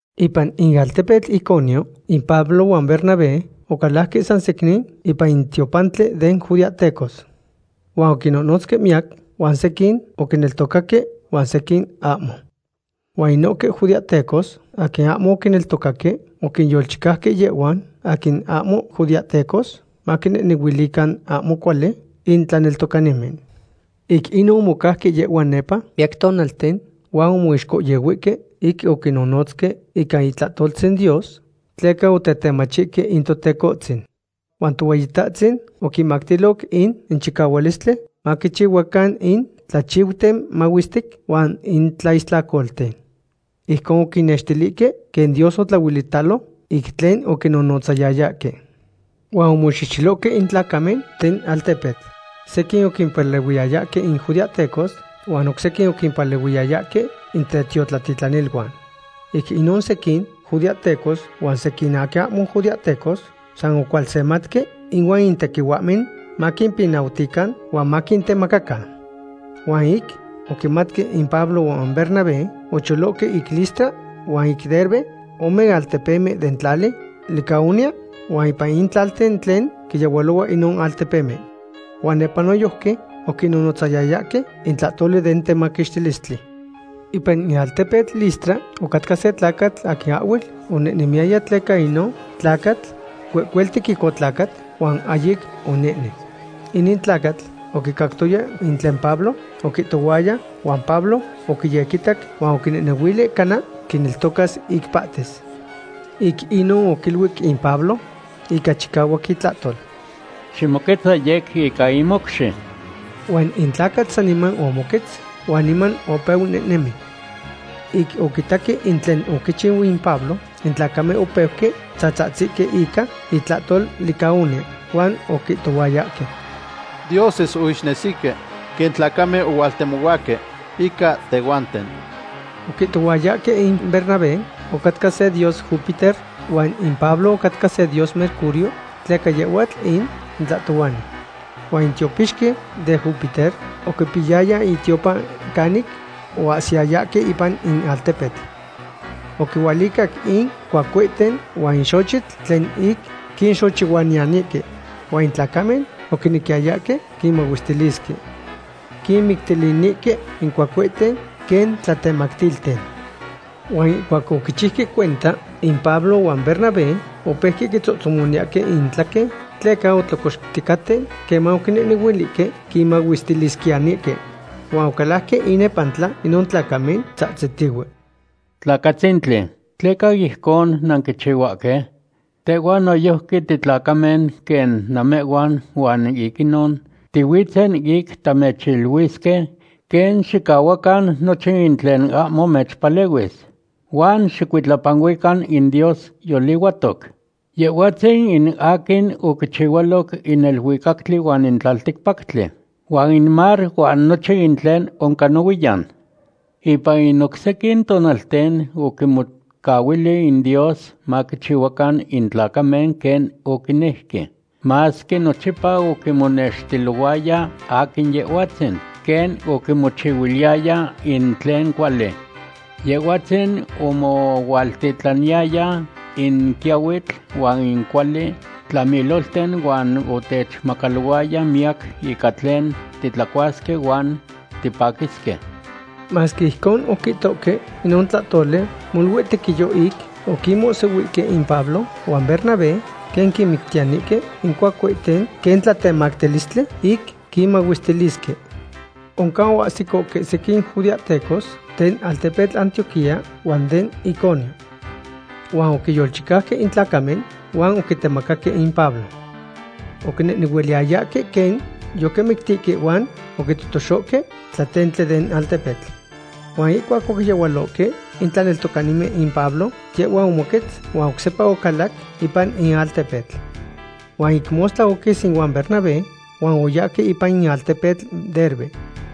Ipan in altepetl Iconio in Pablo huan Bernabé ocalajque sansecnin ipan in tiopantli den judeahtecos. Huan oquinnonotzque miyac, huan sequin oquineltocaque huan sequin ahmo. Huan inohque judeahtecos aquin ahmo oquineltocaque oquinyolchicauque yehhuan aquin ahmo judeahtecos, maquinehnehuilican ahmo cuali in tlaneltocanimen. Ic inon omocauque yehhuan nepa miyac tonalten, huan omoixcohyehuihque ic oquinnonotzque ica itlahtoltzin Dios, tleca otetemachihque in Totecohtzin. Huan Tohueyitahtzin oquinmactilo in chicahualistli maquichihuacan in tlachiuten mahuestic huan in tlaistlacolten. Ijcon oquinnextilihque quen Dios otlahuelitalo ic tlen oquinonotzayayahque. Huan omoxehxelohque in tlacamen den altepetl. Sequin oquimpalehuiyayahque in judeahtecos huan oc sequin oquimpalehuiyayahque in tetiotlatitlaniluan. Ic inon sequin judeahtecos huan sequin in aquin ahmo judeahtecos san ocualsematque ihuan in tequihuahmen maquimpinautican huan maquintemacacan. Huan ic oquimatque in Pablo huan Bernabé, ocholohque ic Listra huan ic Derbe, ome altepemen den tlali Licaonia huan ipan in tlalten tlen quiyehualohua inon altepemen. Huan nepa noyojqui oquinnonotzayayahque in tlahtoli den tlamaquixtilistli. Ipan in altepetl Listra ocatca se tlacatl aquin ahhuel onehnemiyaya tleca inon tlacatl cuecueltic ic otlacat, huan ahyic onehnen. Inin tlacatl oquicactoya in tlen Pablo oquihtohuaya huan Pablo oquiyequitac huan oquinehnehuili cana quineltocas ic pahtis. Ic inon oquiluic in Pablo ica chicahuac itlahtol: ―Ximoquetza yec ica in mocxi. Huan in tlacatl saniman omoquetz huan niman opeu nehnemi. Ic oquitaque in tlen oquichiu in Pablo, in tlacamen opeuque tzahtzihque ica itlahtol Licaonia, huan oquihtohuayahque: ―¡Dioses oixnesihque quen tlacamen ohualtemohuahque ica tehhuanten! Oquihtohuayahque in Bernabé ocatca se dios Júpiter huan in Pablo ocatca se dios Mercurio, tleca yehhuatl in tlahtohuani. Huan in tiopixqui den Júpiter oquipiyaya itiopan canic oahsiyayahque ipan in altepetl. Oquihualicac in cuacuehten huan in xochitl tlen ic quinxochihuayanihque. Huan in tlacamen oquinequiyayahque quinmahuestilisque. Quinmictilinihque in cuacuehten quen tlatemactilten. Huan ihcuac oquichiuque cuenta in Pablo huan Bernabé, opeuque quitzohtzomotzahque intlaquen tleca otlocoxticaten queman oquinehnehuilihque quinmahuestilisquiyanihque. Huan ocalajque inepantla inon tlacamen, tzahtzitihue: ―¡Tlacatzitzin! ¿Tleca ijcon nanquichihuahque? Tehhuan noyojqui titlacamen quen namehhuan huan ic inon tihuitzen ic tamechiluisque quen xicahuacan nochin in tlen ahmo mechpalehuis, huan xicuitlapanuican in Dios yolihuatoc. Yehhuatzin in aquin oquichihualoc in neluicactli huan in tlalticpactli, huan in mar huan nochin tlen oncan nohuiyan. Ipan in oc sequin tonalten oquinmocahuili in Dios maquichihuacan in tlacamen quen oquinejque, masque nochipa oquinmonextilohuaya aquin Yehhuatzin quen oquinmochihuiliyaya in tlen cuali. Yehhuatzin omohualtitlaniyaya in quiahuitl huan in cuali tlamilolten huan otechmacalohuaya miyac ica tlen titlacuasque huan tipaquisque. Masque ijcon oquihtohque inon tlahtoli, molui tequiyo ic oquinmohsihuihque in Pablo huan Bernabé quen quinmictiyanihque in cuacuehten quen tlatemactilistli ic quinmahuestilisque. Oncan oahsicohque sequin judeahtecos den altepetl Antioquía huan den Iconio. Huan oquinyolchicauque in tlacamen huan oquitemacaque in Pablo. Oquinehnehuiliyayahque quen yoquimictihque huan oquitotoxohque tlatentli den altepetl. Huan ihcuac oquiyehualohque in tlaneltocanimen in Pablo, yehhua omoquetz huan oc sepa ocalac ipan in altepetl. Huan ic mostla oquis ihuan Bernabé huan oyahque ipan in altepetl Derbe.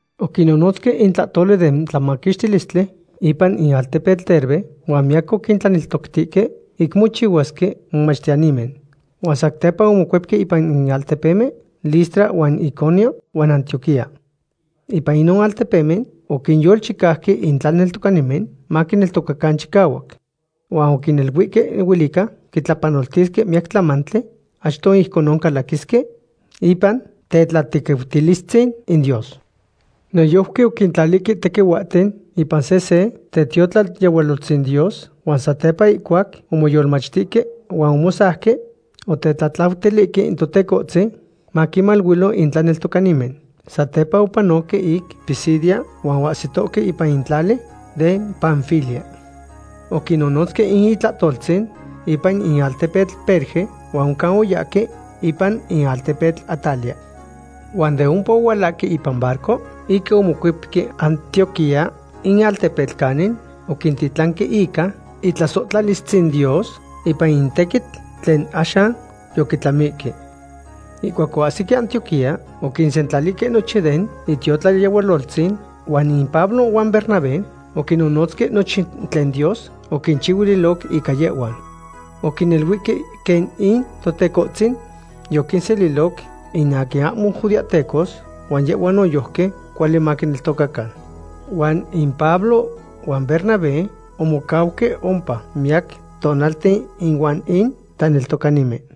Oquinnonotzque in tlahtoli den tlamaquixtilistli ipan in alteptl Derbe huan miyac oquinneltoctihque ic mochihuasque momachtiyanimen. Huan satepa omocuepque ipan in altepemen Listra huan Iconio huan Antioquía. Ipan inon altepemen oquinyolchicauque in tlaneltocanimen maquineltocacan chicahuac. Huan oquiniluihque huelica quitlapanoltisque miyac tlamantli achto ijcon calaquisque ipan tetlatequiutilistzin in Dios. Noyojqui oquintlalihque tequihuahten ipan sehse tetiotlayehualoltzin Dios, huan satepa ihcuac omoyolmachtihque huan omosauque, otetlatlautilihque in Totecohtzin maquinmaluilo in tlaneltocanimen. Satepa opanoque ic Pisidia huan oahsitohque ipan in tlali den Panfilia. Oquinonotzque in itlahtoltzin ipan in altepetl Perge, huan oncan oyahque ipan in altepetl Atalia. Huan de ompa ohualahque ipan barco ic omocuepque Antioquía, in altepetl canin oquintitlanque ica itlasohtlalistzin Dios ipan in tequitl tlen axan yoquitlamihque. Ihcuac oahsique Antioquía, oquinsentlalihque nochin den itiotlayehualoltzin huan in Pablo huan Bernabé oquinnonotzque nochin tlen Dios oquinchihuililoc ica yehhuan. Oquiniluihque quen in Totecohtzin yoquinseliloc in aquin ahmo judeahtecos, huan yehhuan noyojqui cuali maquineltocacan. Huan in Pablo huan Bernabé omocauque ompa miyac tonalten ihuan in tlaneltocanimen.